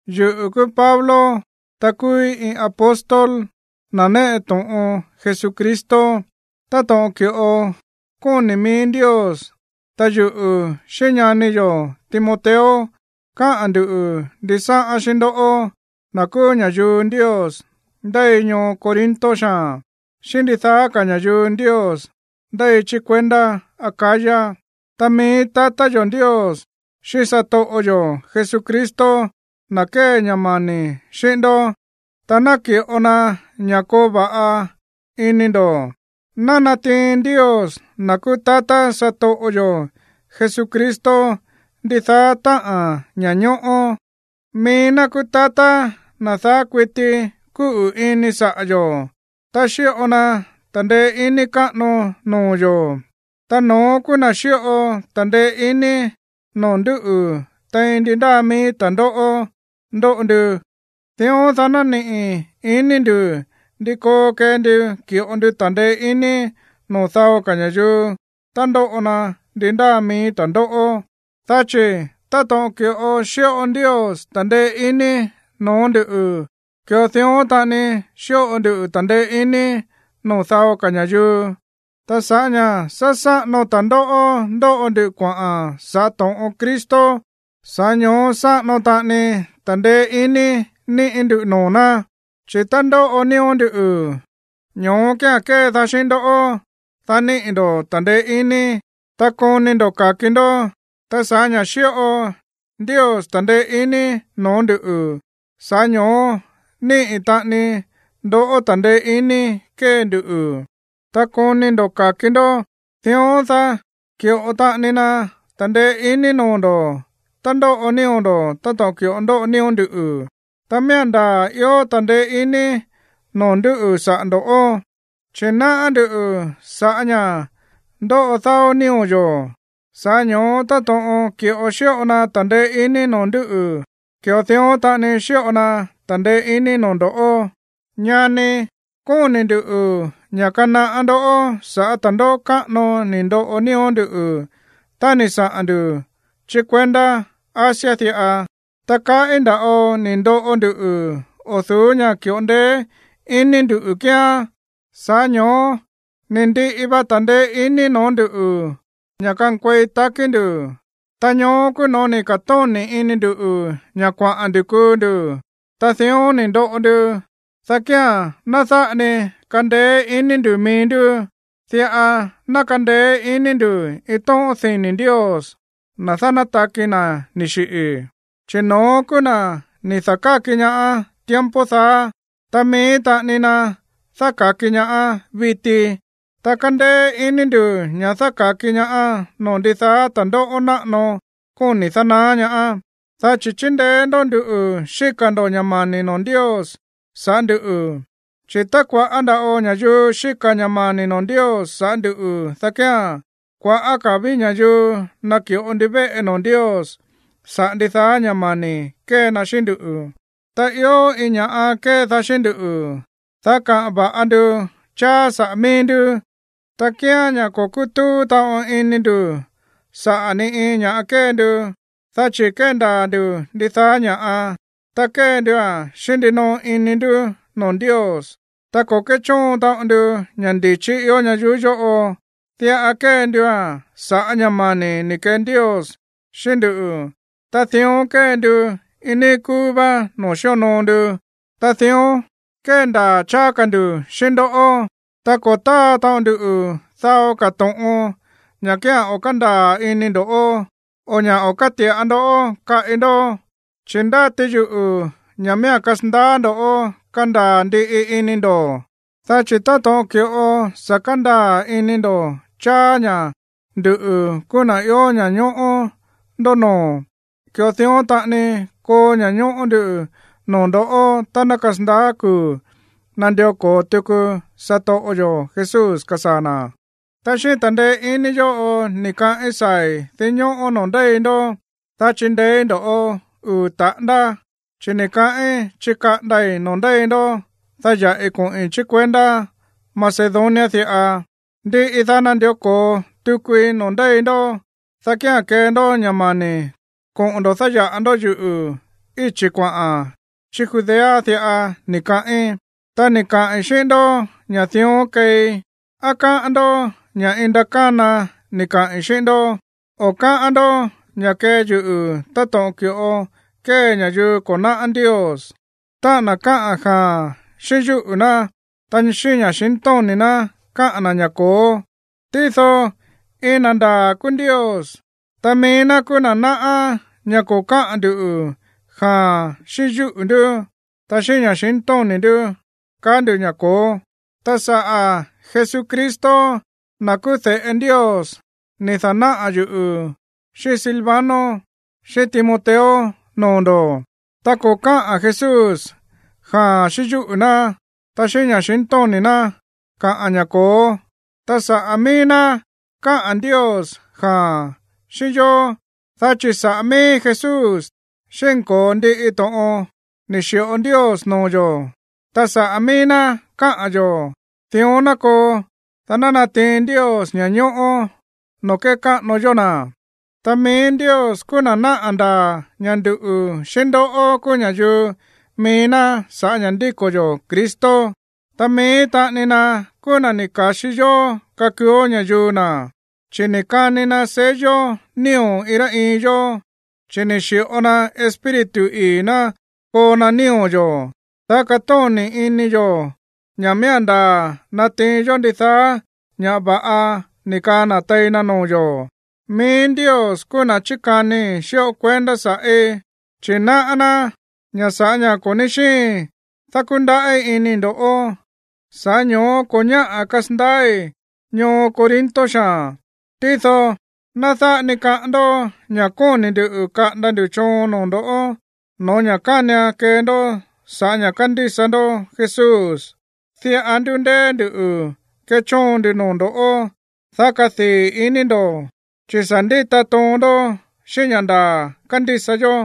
Yuꞌu̱ kúú Pablo, ta kúúí iin apóstol, na̱ néꞌe to̱ꞌon Jesucristo, táto̱ꞌon ki̱ꞌo kóni̱ mií Ndios. Ta yuꞌu̱ xíꞌín ñani yo̱ Timoteo káꞌa̱n ndu̱ ndisáꞌán xíꞌín ndoꞌó, na̱ kúú ña̱yuu Ndios ndéi ñoo Corinto xaa̱n, xíꞌín ndidaá ka̱ ña̱yuu Ndios ndéi chí kuendá Acaya. Ta mií tatá yo̱ Ndios xíꞌín satoꞌo yo̱ Jesucristo ná kee ña̱ mani̱ xíꞌín ndó, ta naki̱ꞌo ná ña̱ koo va̱ꞌa ini ndo̱. Ná natiin Ndios, na̱ kúú tatá satoꞌo yo̱ Jesucristo, ndidaá táꞌa̱n ña̱ñóꞌó. Mií ná kúú tatá, na̱ daá kuití kúꞌu̱ ini saꞌa̱ yo̱, ta xíꞌo na ta̱ndeé iní káꞌano noo̱ yo̱. Ta no̱ón kúú na̱ xíꞌo ta̱ndeé iní noo̱ ndúꞌu̱ tein ndi ndáa mií ta̱ndóꞌó ndóꞌo ndu, dión, dá ná niꞌi̱ iní ndu̱ ndi koo kee ndu ki̱ꞌo ndu ta̱ndeé iní noo̱ dao ka̱ ña̱yuu tá ndóꞌo na ndi ndáa mií ta̱ndóꞌó. Dá chi̱ táto̱ꞌon ki̱ꞌo xíꞌo Ndios ta̱ndeé iní no̱ó nduꞌu̱, ki̱ꞌo dión taꞌani xíꞌo ndu ta̱ndeé iní noo̱ dao ka̱ ña̱yuu. Ta sa̱ꞌá ña̱ sá sáꞌano ta̱ndóꞌó ndóꞌo ndu kuaꞌa̱n sa̱ꞌá to̱ꞌon Cristo, sa̱ꞌá ño̱ó sáꞌano taꞌani ta̱ndeé iní níꞌi̱ ndú noo̱ ná. Chi̱ tá ndóꞌo nío̱ ndú, ño̱ó kía̱n kédaá xíꞌín ndó, dá niꞌi̱ ndo̱ ta̱ndeé iní, ta koni ndo̱ ka̱ki ndó. Ta sa̱ꞌá ña̱ xíꞌo Ndios ta̱ndeé iní no̱ó nduꞌu̱, sa̱ꞌá ño̱ó níꞌi̱ taꞌani ndó ta̱ndeé iní kée nduꞌu̱, ta koni ndo̱ ka̱ki ndó. Dión, dá ki̱ꞌo taꞌani na ta̱ndeé iní noo̱ ndo̱ tá ndóꞌo nío̱ ndo̱ táto̱ꞌon ki̱ꞌo ndóꞌo nío̱ nduꞌu̱. Ta miía̱n ndaa̱ ió ta̱ndeé iní noo̱ ndúꞌu̱ saꞌa̱ ndo̱, chi̱ náꞌá ndú ña̱ sa̱ꞌá ña̱ ndóꞌo dáó nío̱ yo̱, sa̱ꞌá ño̱ó táto̱ꞌon ki̱ꞌo xíꞌo na ta̱ndeé iní noo̱ ndúꞌu̱, ki̱ꞌo dión taꞌani xíꞌo na ta̱ndeé iní noo̱ ndo̱ꞌó. Ñani, kóni̱ nduꞌu̱ ña̱ kanaꞌá ndó sa̱ꞌá ta̱ndóꞌó káꞌano ni̱ ndoꞌo nío̱ ndú tá ni̱ saꞌa̱n ndu̱ chí kuendá Asia diꞌa. Ta kaꞌí nda̱ꞌo ni̱ ndoꞌo ndu o̱ du̱ú ña̱ ki̱ꞌo ndeé iní ndu̱ kíán, sa̱ꞌá ño̱ó ni̱ ndiꞌi va ta̱ndeé iní no̱ó nduꞌu̱ ña̱ kankuei takí ndu̱. Ta ño̱ó kúú no̱ó ni̱ ka̱tóni̱ ini ndu̱ ña̱ kuaꞌa̱n ndu̱ kuu ndu̱. Ta dión ni̱ ndoꞌo ndu, dá kía̱n ná dáꞌa ni kandeé iní ndu̱ mií ndú, diꞌa ná kandeé iní ndu̱ iin tóꞌón dini̱ Ndios, na̱ dánátaki na̱ ni̱ xiꞌi̱. Chi̱ no̱ón kúú na̱ ni̱ da̱káki ñaá tiempo daá, ta mií taꞌani na dáka̱ki ñaá viti, ta kándéé iní ndu̱ ña̱ dáka̱ki ñaá noo̱ ndidaá ta̱ndóꞌó náꞌano kóni̱ dánaá ñaá, dá chi̱ chíndeé ndó nduꞌu̱ xíka̱ ndo̱ ña̱ mani̱ noo̱ Ndios sa̱ꞌá nduꞌu̱. Chi̱ tá kua̱ꞌá nda̱ꞌo ña̱yuu xíka̱ ña̱ mani̱ noo̱ Ndios sa̱ꞌá ndu̱, dá kía̱n kuaꞌa̱ ka̱ ví ña̱yuu naki̱ꞌo ndivéꞌe noo̱ Ndios saꞌa̱ ndidaá ña̱ mani̱ kée na xíꞌín ndú. Ta ió iin ña̱ꞌa kédaá xíꞌín ndú, dá kaꞌa̱n va̱ꞌa ndu cháá saꞌa̱ mií ndú, ta kíán ña̱ ko̱ kútúú taꞌon ini ndu̱ saꞌa̱ ni iin ña̱ꞌa kée ndu, dá chi̱ kéndaa̱ ndu̱ ndidaá ña̱ꞌa, ta kée ndua̱n xíꞌín ndinoꞌo ini ndú noo̱ Ndios. Ta ko̱ kéchóon taꞌon ndu ña̱ ndi̱chí ió ñayuú yóꞌo. Diꞌa kée ndua̱n sa̱ꞌá ña̱ mani̱ ni̱ kee Ndios xíꞌín ndú. Ta dión kée ndu iin níí kúú vá noo̱ xíonoo ndu, ta dión kéndaa̱ cháá ka̱ ndu̱ xíꞌín ndoꞌó. Ta ko̱ táa taꞌon ndu dao ka̱ to̱ꞌon, ña̱ kía̱n o̱ kándaa̱ ini ndo̱, o ña̱ o̱ káti̱ꞌa ndó kaꞌi ndó. Chi̱ ndáti yuꞌu̱ ña̱ miía̱n kasandaá ndo̱ kandaa̱ ndiꞌi ini ndo̱, dá chi̱ táto̱ꞌon ki̱ꞌo sa̱ kandaa̱ ini ndo̱ cháá ña̱ nduꞌu̱ kúú na̱ ió ña̱ñóꞌó ndó noo̱, ki̱ꞌo dión taꞌani koo ña̱ñóꞌó ndú noo̱ ndo̱ tá ná kasandaá kuu̱ nandió ko̱o tuku satoꞌo yo̱ Jesús kasaa̱ na̱. Ta xíꞌín ta̱ndeé iní yóꞌo ni̱ kaꞌín saa̱i̱ dinñóꞌó noo̱ ndéi ndó, dá chindeéí ndo̱ꞌó uu̱ taꞌándá, chi̱ ni̱ kaꞌín chikaꞌandai̱ noo̱ ndéi ndó, dá ya̱ꞌi koꞌi̱n chí kuendá Macedonia diꞌa. Ndiꞌi daá, nandió ko̱o tukui noo̱ ndéi ndó, dá kía̱n kee ndó ña̱ mani̱ koꞌo̱n ndo̱ dáya̱ꞌa ndó yuꞌu̱ íchi̱ kuaꞌa̱n chí Judea diꞌa, ni̱ kaꞌín. Tá ni̱ kaꞌi̱n xíꞌín ndó ña̱ dión keei, ¿á káꞌán ndó ña̱ iin ndakána ni̱ kaꞌi̱n xíꞌín ndó? O, ¿á káꞌán ndó ña̱ kée yuꞌu̱ táto̱ꞌon ki̱ꞌo kée ña̱yuu ko̱ náꞌá Ndios, táꞌa̱n na̱ káꞌa̱n “jaa̱n” xíꞌín yúꞌu̱ ná, ta xíꞌín ña̱xintóni̱ ná káꞌa̱n na̱ ña̱ “ko̱ó”? Tído iin na̱ ndaa̱ kúú Ndios, ta mií ná kúú na̱ náꞌá ña̱ ko̱ káꞌa̱n ndu̱ “jaa̱n” xíꞌín yúꞌu̱ ndú, ta xíꞌín ña̱xintóni̱ ndú káꞌa̱n ndu̱ ña̱ “ko̱ó”. Ta sa̱ꞌá Jesucristo, na̱ kúú de̱ꞌe Ndios, ni̱ da̱náꞌa̱ yuꞌu̱ xíꞌín Silvano, xíꞌín Timoteo noo̱ ndo̱. Ta ko̱ káꞌa̱n Jesús “jaa̱n” xíꞌín yúꞌu̱ ná, ta xíꞌín ña̱xintóni̱ ná káꞌa̱n ña̱ “ko̱ó”. Ta saꞌa̱ mií ná káꞌa̱n Ndios “jaa̱n” xíꞌín yó, dá chi̱ saꞌa̱ mií Jesús xínko̱o ndiꞌi to̱ꞌon ni̱ xi̱ꞌo Ndios noo̱ yo̱, ta saꞌa̱ mií ná káꞌa̱n yo̱ “Dión ná koo” dá ná natiin Ndios ña̱ñóꞌó noo̱ kékáꞌano yó na̱. Ta mií Ndios kúú na̱ náꞌa̱ ndaa̱ ña̱ nduꞌu̱ xíꞌín ndoꞌó kúú ña̱yuu mií ná sa̱ꞌá ña̱ ndíko̱ yo̱ Cristo, ta mií taꞌani na kúú na̱ ni̱ ka̱xi yó kakuuó ña̱yuu na̱, chi̱ ni̱ kani na sello nío̱ iin rá iin yó, chi̱ ni̱ xi̱ꞌo na Espíritu ii̱ ná koo na nío̱ yo̱, dá katóni̱ ini yo̱ ña̱ miía̱n ndaa̱ natiin yó ndidaá ka̱ ña̱ va̱ꞌa ni̱ kaa na̱ tei na noo̱ yo̱. Mií Ndios kúú na̱ chíkanii xíꞌo kuendá sa̱ꞌí, chi̱ náꞌá ná ña̱ sa̱ꞌá ña̱ ko̱ ní xíin dákúndaꞌí ini ndo̱ꞌó, sa̱ꞌá ño̱ó ko̱ ñáꞌa̱ kasandaái̱ ñoo Corinto xaa̱n. Tído ná dáꞌa ni kaꞌán ndó ña̱ kóni̱ ndu̱ kaꞌanda ndu̱ choon noo̱ ndo̱ no̱ó ña̱ kánian kee ndó sa̱ꞌá ña̱ kándísa ndó Jesús. Diꞌa ndúndéé nduꞌu̱ kéchóon ndu noo̱ ndo̱, dá kadii̱ ini ndo̱, chi̱ sa̱ ndíta toon ndó xíꞌín ña̱ ndaa̱ kándísa yó.